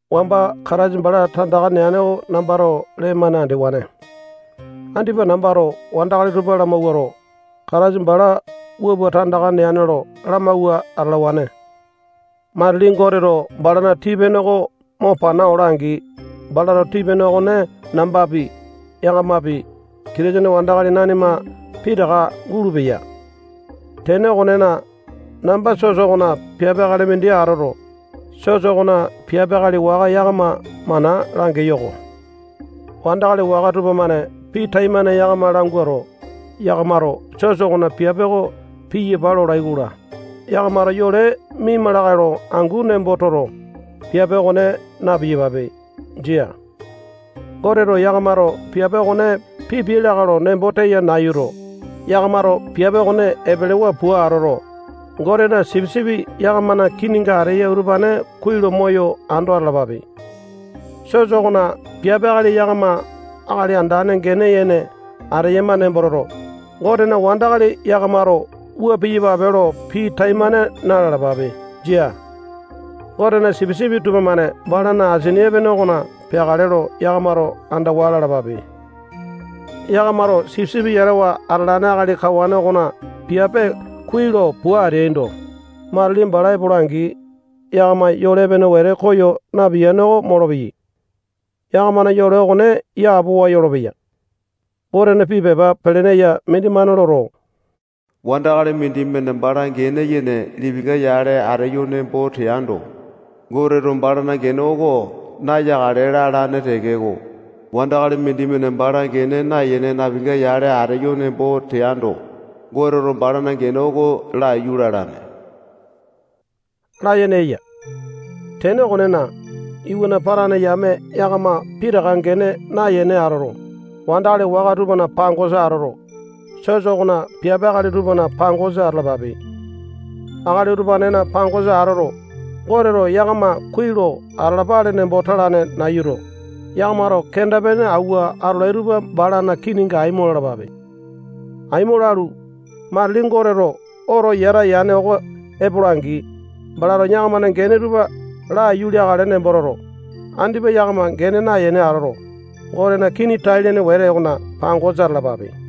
Wamba Kataisa bala tandaka neane oko nambato lee-mane andewane. Andipa nambato wandakali tupa lamawuato, Kataisa bala wua pua tandaka neane lo lamawua atalawane. Matili Goteto balana tii-pene oko mo pana ola-angi, balato tii-pene okone nambapi, yakamapi, Kitisene wandakali nanima nanima pitaka gulupeya. Tene okonena, namba sosa okona piape akali mindi atoto, sosa okona piape akali waka yakama mana langeyo-ko. Wandakali waka tupamane pii taimane yakama languato, yakamato sosa okona piape oko piyapa lolai-kola, yakamato yole miaima lakae lo angu nembo toto, piape okone na-piyapape. Jia. Goteto yakamato piape okone pipiai lakae lo nembo teya nayuto, yakamato piape okone epelewa pua atoto, Gotena sipisipi yakamana kininga ateyai utupane kuai lo moyo ando atalapape. Sosa okona piape akali yakama akali andane gene yene ateyama nembo toto, Gotena wandakali yakamato wua piyapape lo pii taimane na-lalapape. Jia. Gotena sipisipi tupamane balana asini epene okona peakale lo yakamato andawa lalapape. Yakamato sipisipi yatawa atalane akali kawane okona piape kuai lo pua ateaindo, matili bala epola-angi, yakama yole epene wete koyo napiyane oko molopeyai. Yakamana yole okone yapowa yolopeya. Gotena pii pepa pelene eya mindimane loto, wandakali mindimane bala gene yene lipinga yale ateyo nembo teando, Goteto balana gene oko nayakale lalane tekeko, wandakali mindimane bala gene nayene napinga yale ateyo nembo teando, Goteto balana gene oko laiyu lalane layene eya. Tene okonena, iwana patane yame yakama pitaka gene nayene atoto, wandakali waka tupana pangosa atoto, sosana piape akali tupana pangosa atalapape. Akali utupanena pangosa atoto, Goteto yakama kuai lo atalapale nembo talane nayuto, yakamato kenda-pene awua atolai tupa balana kininga aimo lalapape. Aimo lalu, matili Goteto oto yata yane oko epola-angi, balato yakamana gene tupa laiyu leakale nembo toto, andipa yakama gene nayene atoto, Gotena kini tai-lene wete okona pangosa atalapape.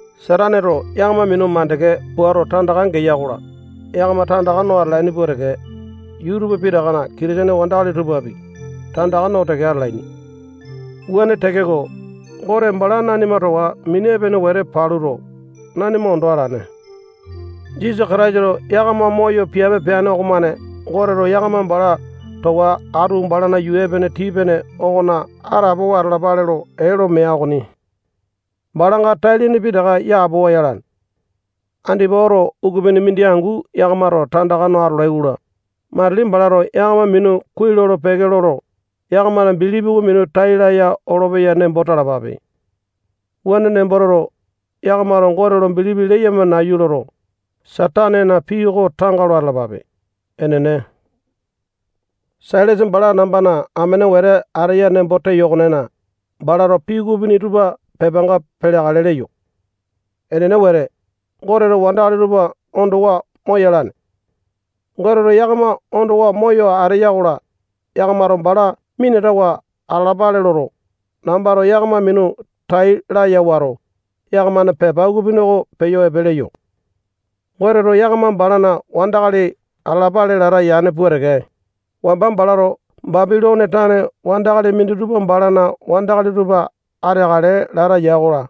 Sataneto yakama minu mandeke puato tandaka geya-kola, yakama tandaka no atalaini pua teke, yuu tupa pitakana Kitisene wandakali tupapi, tandaka no teke atalaini. Wuane tekeko, Gote bala nanima towa mini epene wete paluto, nanima ondo alane. Jisasa Kataisato yakama moyo piape peane okomane Goteto yakama bala towa atu balana yuu epene tii-pene okona atapowa atalapale lo ee lo mea okoni. Balanga tai-lene pitaka yapowa yalane. Andipa oto ukupini mindi angu yakamato tandaka no atolai-kola, matili balato yakama minu kuai lolo-peke loto, yakamana bilipi oko minu tai laya olopeya nembo talapape. Wuane nembo toto, yakamato Gote lo bilipi leyama nayu loto, Satanena pii oko tanga lo atalapape. Enene. Sailasa bala nambana amene wete ateya nembo teyo okonena, balato pii ukupini utupa pepanga peleakale leyo. Enene wete, Goteto wandakali tupa ondowa moyalane. Goteto yakama ondowa moyo ateya-kola, yakamato bala minatawa atalapale loto, nambato yakama minu tai laya wato, yakamana pepa ukupini oko peyo epe leyo. Goteto yakama balana wandakali atalapale lata yane pua teke, wamba balato Bapilone tane wandakali minditupa balana wandakali tupa ateakale lata ya-kola,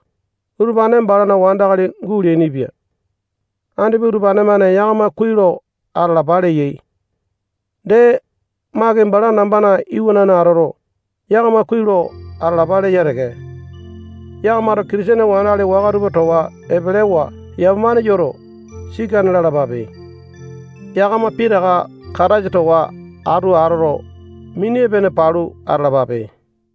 utupane balana wandakali guleainipia. Andipa utupane-mane yakama kuai lo atalapa leyai. Dee, Maki bala nambana iwanane atoto, yakama kuai lo atalapa leya teke. Yakamato Kitisene wandakali waka tupa towa epelewa yamapane yoto, sikane lalapape. Yakama pitaka Kataisa towa atu atoto, mini epene palu atalapape.